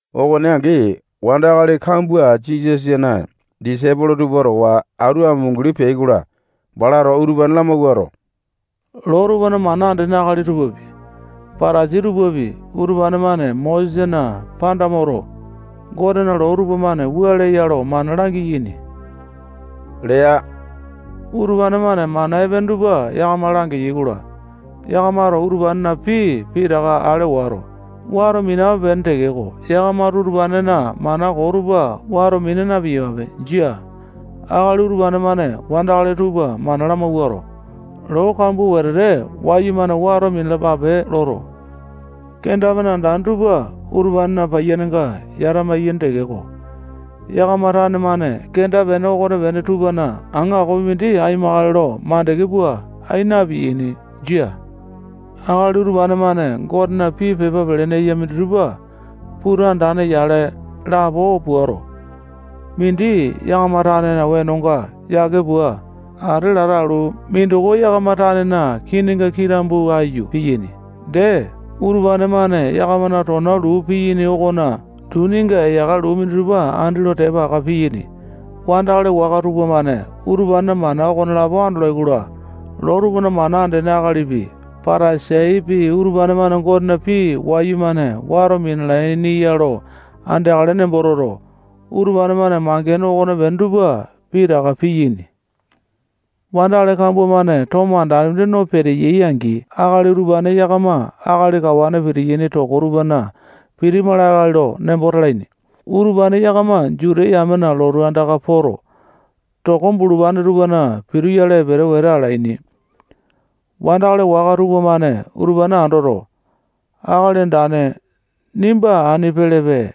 Okone angi, wandakali kambua Jisasana disaipolo tupa towa atu amunguli peai-kola, balato utupane lamawuato, loo tupana mana andene akali tupapi, Patasai tupapi, utupane-mane Mosesana panda moto, Gotena loo tupamane wua leya lo mana langiyaini lea. Utupane-mane mana epene tupa yakama langeyai-kola, yakamato utupanena pii pitaka ale wato, wato minape-pene tekeko, yakamato utupanena mana koo tupa wato mina na-piyapape. Jia. Akali utupane-mane wandakali tupa mana lamawuato, loo kambua wetete wayumane wato minalapape loto, kenda-pene andane tupa utupanena paiyanenga yata-maiyaini tekeko, yakama tane-mane kenda-pene okonepene tupana aŋakopi mindi aimakale lo makande pua ai na-piyaini. Jia. Akali utupane-mane Gotena pii pepa pelene eya minditupa puta andane-yale lapo puato, mindi yakama tanena wenonga yake pua ate lata alu, mindoko yakama tanena kininga kitambu ayu, piyaini. Dee, utupane-mane yakamana tona luu piyaini okona duninga eyaka luu minditupa andi lo tepa aka piyaini. Wandakali waka tupamane utupanena mana okonelapo andolai-kola, loo tupana mana andene akalipi, Patasaipi, utupane-mane Gotena pii wayumane wato minalaini ya lo andeakale nembo toto, utupane-mane mangene okonepene tupa pitaka piyaini. Wandakali kambua-mane tomo andane mindi no peteyai-angi, akali utupane yakama akali kawane pitiyaini toko tupana pitima lakae lo nembo talaini. Utupane yakama Juta yamena lotu andaka poto, toko bulupane tupana pituyale epele wete alaini. Wandakali waka tupamane utupane andoto, akali andane, nimba ani pelepe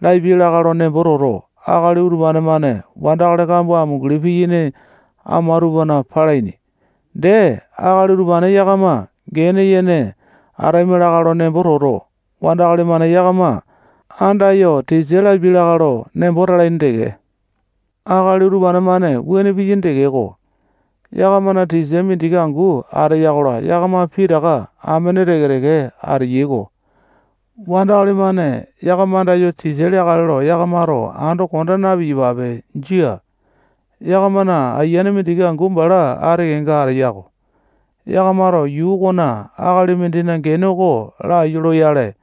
lapiai lakae lo nembo toto, akali utupane-mane wandakali kambua amunguli piyaini ama tupana palaini. Dee, akali utupane yakama gene yene ataima lakae lo nembo toto, wandakali-mane yakama andayo tisa lapiai lakae lo nembo talaini teke. Akali utupane-mane wuane piyaini tekeko, yakamana tisa mindiki angu ateya-kola, yakama pitaka amene teke-teke ateyai-ko. Wandakali-mane yakama andayo tisa leakale lo yakamato ando konda na-piyapape. Jia. Yakamana ayiane mindiki angu bala ati kenga ateya-ko. Yakamato yuu okona akali mindina gene oko laiyu loyale,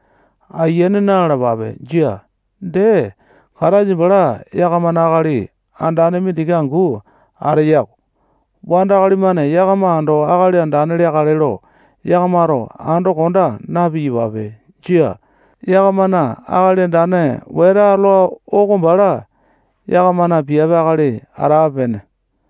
ayiane na-lalapape. Jia. Dee, Kataisa bala yakamana akali andane mindiki angu ateya-ko. Wandakali-mane yakama ando akali andane leakale lo yakamato ando konda na-piyapape. Jia. Yakamana akali andane wete atola oko bala yakamana piape akali atape-pene.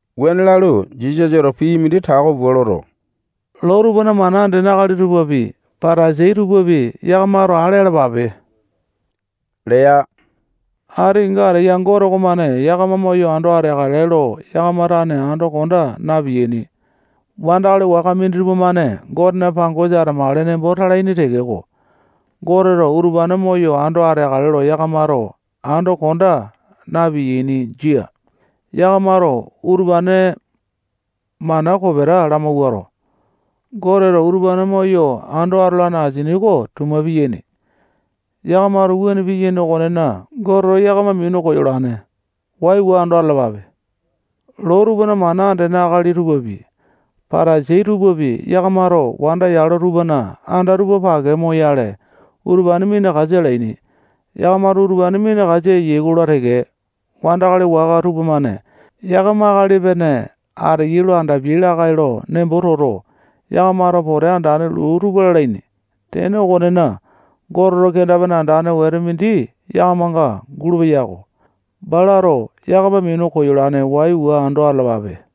Wuane lalu, Jisasato pii mindi tako pua loto, loo tupana mana andene akali tupapi, Patasai tupapi, yakamato ale alapape lea. Ati kenga ateya Gote okomane yakama moyo ando ateakale lo yakama tane ando konda na-piyaini. Wandakali waka minditupa-mane Gotena pangosa atamakale nembo talaini tekeko, Goteto utupane moyo ando ateakale lo yakamato ando konda na-piyaini. Jia. Yakamato utupane mana kopeta lamawuato, Goteto utupane moyo ando atolane asini oko tuma piyaini. Yakamato wuane piyaini okonena, Goteto yakama minu koyolane. Waiwa ando atalapape. [Loo tupana mana andene akali tupapi, Patasai tupapi, yakamato wanda yalo tupana anda tupa pake moyale utupane minakasa alaini. Yakamato utupane minakasa eyai-kola teke, wandakali waka tupamane yakama akali epene ateyai lo andapiai lakae lo nembo toto, yakamato pote andane luu tupa lalaini. Tene okonena, Goteto kenda-pene andane wete mindi yakamanga gulupeya-ko. Balato yakama minu koyolane. Waiwa ando atalapape.]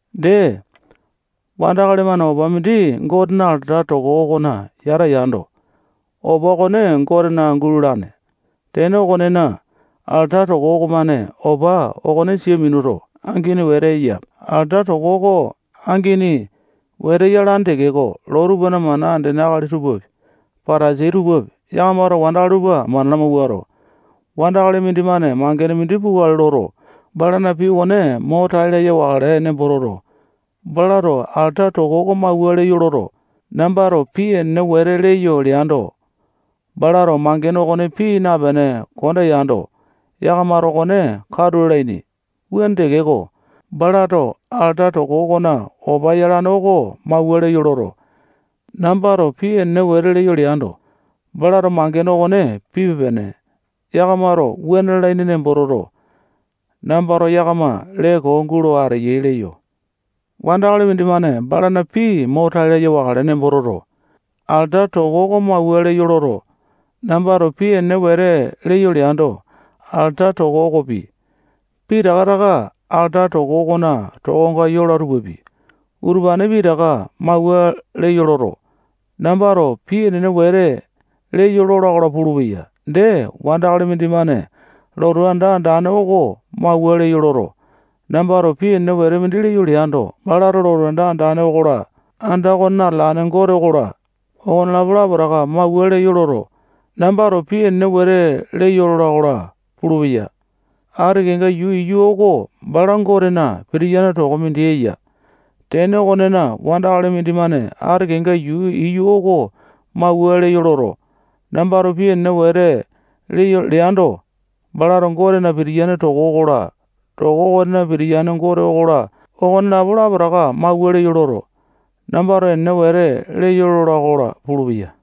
Dee, wandakali-mane opa mindi Gotena alata toko okona yata yando, opa okone Gotena gulalane. Tene okonena, alata toko okomane opa okone sia minuto, angini wete eya. Alata toko oko angini wete yalane tekeko, loo tupana mana andene akali tupapi, Patasai tupapi, yakamato wandakali tupa mana lamawuato, wandakali mindimane mangene mindi pukale loto, balana pii okone mo tai laya wakale nembo toto, balato alata toko oko mawua leyo loto, nambato pii enene wete leyo leando, balato mangene okone pii napene konda yando, yakamato okone katu lalaini. Wuane tekeko, balato alata toko okonena opa yolane oko mawua leyo loto, nambato pii enene wete leyo leando, balato mangene okone pipe-pene. Yakamato wuane lalaini nembo toto, nambato yakama lee koo gulo ateyai leyo. Wandakali mindimane balana pii mo tai laya wakale nembo toto, alata toko oko mawua leyo loto, nambato pii enene wete leyo leando, alata toko okopi, pitaka taka alata toko okona tokonga yola tupapi, utupane pitaka mawua leyo loto, nambato pii enene wete leyo lola-kola pulupeya. Dee, wandakali mindimane lotu anda andane oko mawua leyo loto, nambato pii enene wete leyo leando, balato lotu anda andane okola, anda okonena atalane Gote okola, okonelapo lapotaka mawua leyo loto, nambato pii enene wete leyo lola-kola pulupeya. Ati kenga yuu iyu oko bala Gotena pitiyane toko mindi eya. Tene okonena, wandakali mindimane ati kenga yuu iyu oko mawua leyo loto, nambato pii enene wete leyo leando, balato Gotena pitiyane toko okola, toko okonena pitiyane Gote okola, okonelapo lapotaka mawua leyo loto, nambato enene wete leyo lola-kola pulupeya.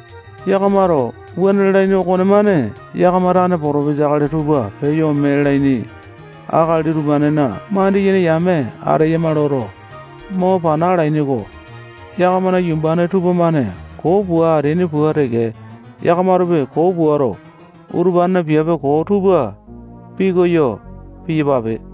Yakamato wuane lalaini okonemane yakama tane potopesa akali tupa peyo ome leaini akali utupanena mandiyene yame ateyama loto, mo pana alaini-ko. Yakamana yumbane tupamane koo pua ateaini pua teke, yakamatopi koo puato, utupanena piape koo tupa pikoyo piyapape.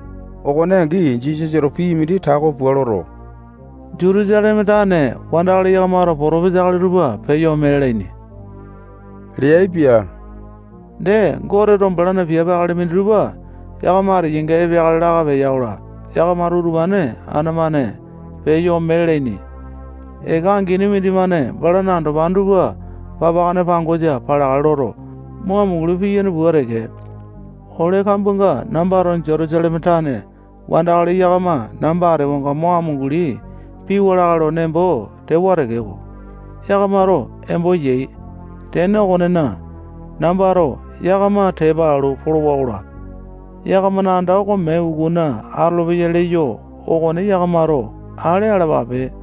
Okone angi, Jisasato pii mindi tako pua loto, Jutusaleme tane wandakali yakamato potopesa akali tupa peyo ome lalaini leaipia. Dee, Goteto balana piape akali minditupa yakama ateyainga epeakale laka peya-kola, yakamato utupane ana-mane peyo ome lalaini. Eka angini mindimane balana andopane tupa papakane pangosa paleakale loto, mo amunguli piyane pua teke, ole kambuanga nambato Jutusaleme tane wandakali yakama namba atewanga mo amunguli piwa lakae lo nembo tewa tekeko, yakamato embo yai. Tene okonena, nambato yakama tepa alu polowa-kola, yakamana anda oko mee ukuna atolopeya leyo okone yakamato ale alapape.